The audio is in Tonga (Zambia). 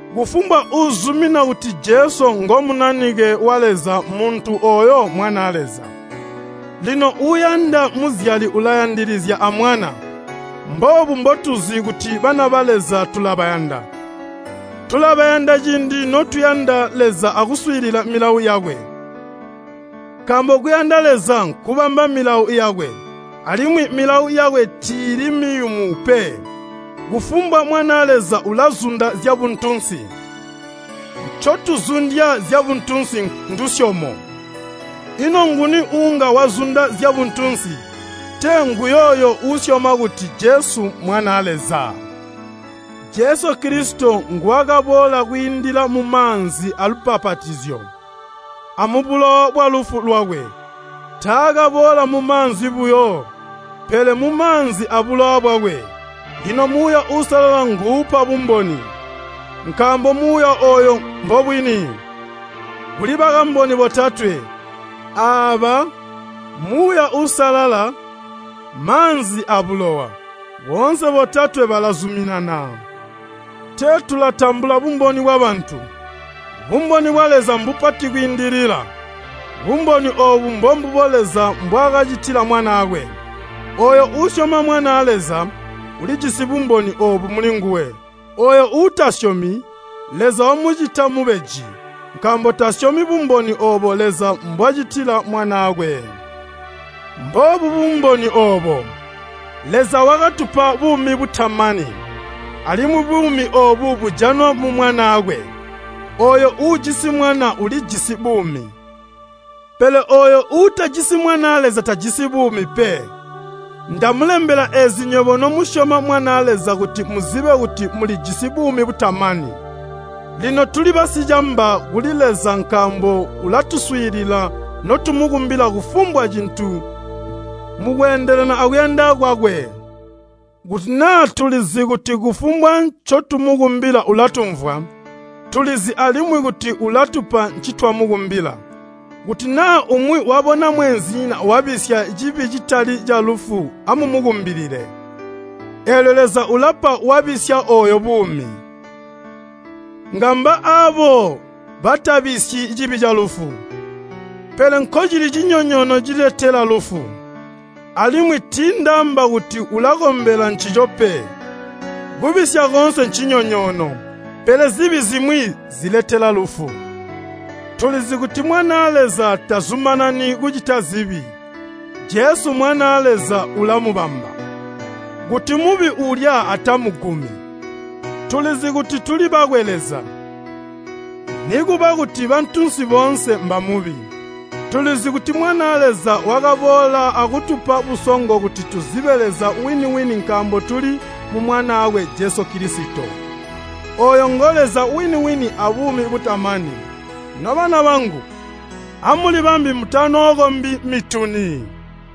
Kufumbwa uuzumina kuti Jesu ngo Munanike wa Leza muntu ooyo mmwanaa Leza. Lino uuyanda muzyali ulayandilizya amwana. Mboobu mbotuzi kuti bana ba Leza tulabayanda, tulabayanda ciindi notuyanda Leza akuswiilila milawo yakwe. Nkaambo kuyanda Leza nkubamba milawo yakwe, alimwi milawo yakwe tiili miyumu pe. Kufumbwa mwanaa Leza ulazunda zyabuntunsi. Ncotuzundya zyabuntunsi ndusyomo. Ino nguni uunga wazunda zyabuntunsi, tee nguyooyo uusyoma kuti Jesu Mwanaa Leza. Jesu Kilisito nguwakaboola kwiindila mumaanzi aalubbapatizyo amubulowa bwalufu lwakwe. Taakaboola mumaanzi buyo, pele mumaanzi abulowa bwakwe. Lino Muuya Uusalala nguupa bumboni, nkaambo Muuya ooyo mbobwini. Kuli bakamboni botatwe, aaba: Muuya Uusalala, maanzi, abulowa. Boonse botatwe balazuminana. Tee tulatambula bumboni bwabantu, bumboni bwa Leza mbupati kwiindilila. Bumboni oobu mbombubo Leza mbwaakacitila Mwanaakwe. Ooyo uusyoma Mwanaa Leza, ulijisi bumboni oobu mulinguwe. Ooyo uutasyomi, Leza wamucita mubeji, nkaambo tasyomi bumboni oobo Leza mbwacitila Mwanaakwe. Mboobu bumboni oobo, Leza wakatupa buumi butamani, alimwi buumi oobu bujanwa mu Mwanaakwe. Ooyo uujisi Mwana ulijisi buumi, pele ooyo uutajisi Mwanaa Leza tajisi buumi pe. Ndamulembela eezi nywebo nomusyoma Mwanaa Leza kuti muzibe kuti mulijisi buumi butamani. Lino tuli basicamba kuli Leza nkaambo ulatuswiilila notumukumbila kufumbwa cintu mukweendelana akuyanda kwakwe. Kuti naa tulizi kuti kufumbwa ncotumukumbila ulatumvwa, tulizi alimwi kuti ulatupa ncitwamukumbila. Kuti naa umwi wabona mweenzinyina wabisya cibi citali calufu amumukumbilile, eelyo Leza ulapa wabisya ooyo buumi. Ngamba aabo batabisyi cibi calufu. Pele nkocili cinyonyoono ciletela lufu, alimwi tiindaamba kuti ulakombela ncico pe. Kubisya koonse ncinyonyoono, pele zibi zimwi ziletela lufu. Tulizi kuti mwanaa Leza tazumanani kucita zibi. Jesu Mwanaa Leza ulamubamba, kuti Mubi uulya atamugumi. Tulizi kuti tuli bakwe Leza, nikuba kuti bantunsi boonse mba Mubi. Tulizi kuti Mwanaa Leza wakaboola akutupa busongo kuti tuzibe Leza wini-wini nkaambo tuli mu Mwanaakwe Jesu Kilisito. Ooyo ngo Leza wini-wini abuumi butamani. Nobana bangu, amulibambe mutanookombi mituni!